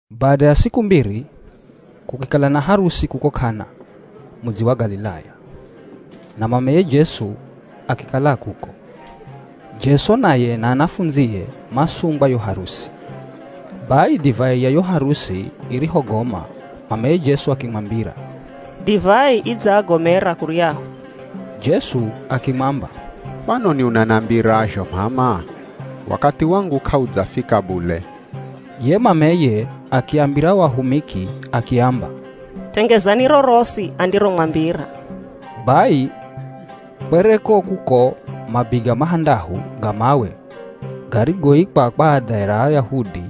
Bada ya siku mbiri kukikala na harusi kuko K'ana, mudzi wa Galilaya; na mameye Jesu akikala a kuko. Jesu naye na anafundzie masungwa yo harusi. Bai divai ya yo harusi irihogoma mameye Jesu akimwambira, “Divai idzaagomera kuryahu.” Jesu akimwamba, “Kwanoni unanambira zho m'ama? Wakathi wangu k'audzafika bule.” Ye mameye akiambira o ahumiki akiamba, “Tengezani rorosi andiromwambira.” Bai kwereko kuko mabiga mahandahu ga mawe garigoikwa kwa adha ra Ayahudi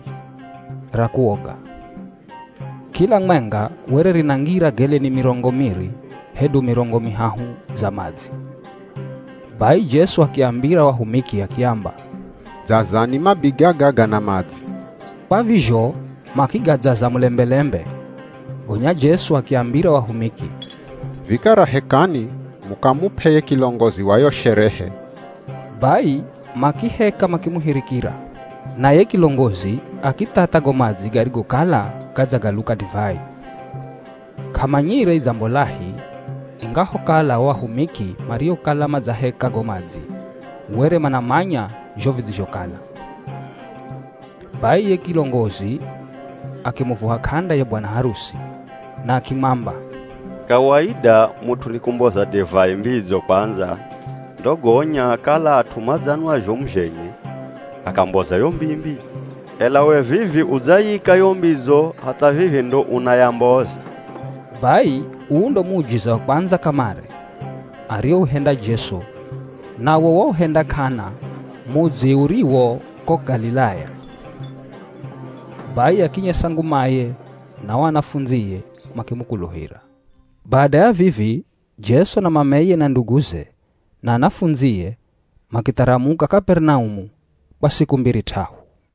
ra kuoga. Kila mwenga were rinangira geleni mirongo miri hedu mirongo mihahu za madzi. Bai Jesu akiambira o ahumiki akiamba, “Dzazani mabiga gaga na madzi.” Kwa vizho makigadzaza mulembelembe. Gonya Jesu akiambira o ahumiki, “Vikara hekani mukamup'e ye kilongozi wa yo sherehe.” Bai makiheka makimuhirikira, na ye kilongozi akithatha go madzi garigokala gadzagaluka divai. K'amanyire idzambolahi, ingahokala o ahumiki mariokala madzaheka go madzi were manamanya zho vidzizhokala. Bai ye kilongozi akimuvuha k'anda ye bwana harusi, na akimwamba, “Kawaida mut'u ni kumboza divai mbidzo kwandza ndo gonya kala at'u madzanwa zhomu zhenye, akamboza yo mbii-mbii, ela we vivi udzayika yo mbidzo hatha vivi ndo unayomboza.” Bai uu ndo muujiza wa kwandza kamare ariouhenda Jesu. Nawo wauhenda K'ana, mudzi uriwo ko Galilaya, bai akinyesa ngumaye na o anafundzie makimukuluhira. Bada ya vivi Jesu na mameye na nduguze na anafundzie makitharamuka Kaperinaumu kwa siku mbiri t'ahu.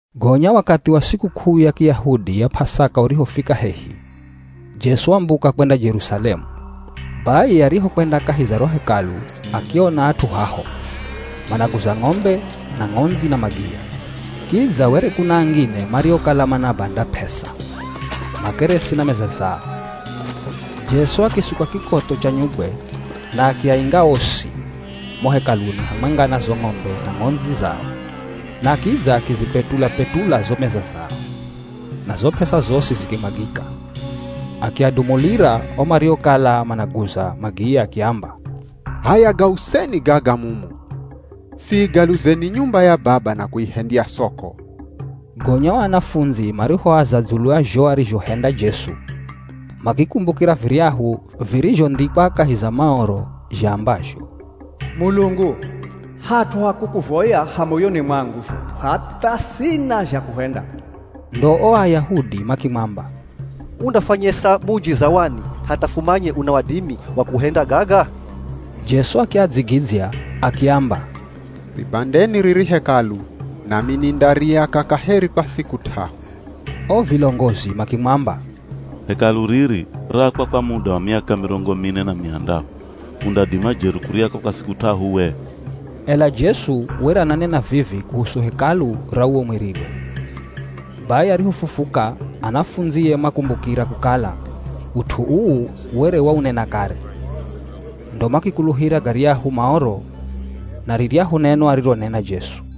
Gonya wakathi wa sikuk'uu ya Kiyahudi ya P'asaka urihofika hehi, Jesu wambuka kwenda Jerusalemu. Bai arihokwenda kahi za ro Hekalu akiona at'u haho, managuza ng'ombe na ng'ondzi na magiya. Kidza were kuna angine mariokala manabanda p'esa, makeresi na meza zao. Jesu akisuka kikotho cha nyugwe na akiainga osi mo Hekaluni hamwenga na zo ng'ombe na ng'ondzi zao. Na kidza akizipetula-petula zo meza zao, na zo p'esa zosi zikimwagika! Akiadumulira o mariokala managuza magiya akiamba, “H'aya gauseni gaga mumu! Siigaluzeni nyumba ya Baba na kuihendya soko!” Gonya o anafundzi marihoaza dzulu ya zho arizhohenda Jesu, makikumbukira viryahu virizhondhikwa kahi za Maoro zhaambazho, “Mulungu, hat'u ha kukuvoya ha moyoni mwangu zhomu hatha sina zha kuhenda.” Ndo o Ayahudi makimwamba, “Undafwanyesa muujiza wani hatha fumanye una wadimi wa kuhenda gaga?” Jesu akiadzigidzya akiamba, “Ribandeni riri Hekalu, nami nindariaka kaheri kwa siku t'ahu.” O vilongozi makimwamba, “Hekalu riri raakwa kwa muda wa miaka mirongo mine na mihandahu, undadima jeri kuriaka kwa siku t'ahu we?” Ela Jesu were ananena vivi kuhusu Hekalu ra uwo mwiriwe. Bai arihofufuka, anafundzie makumbukira kukala ut'u uu were waunena kare. Ndo makikuluhira garyahu Maoro na riryahu neno arironena Jesu.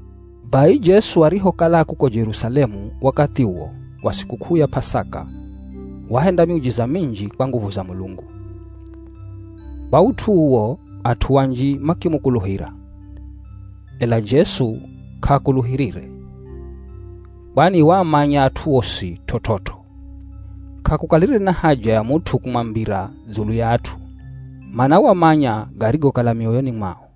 Bai Jesu arihokala a kuko Jerusalemu wakathi uwo wa sikuk'uu ya P'asaka, wahenda miujiza minji kwa nguvu za Mulungu. Kwa ut'u uwo at'u anji makimukuluhira. Ela Jesu k'aakuluhirire, kwani waamanya at'u osi t'ot'ot'o. K'akukalire na haja ya mut'u kumwambira dzulu ya at'u, mana wamanya garigokala mioyoni mwao.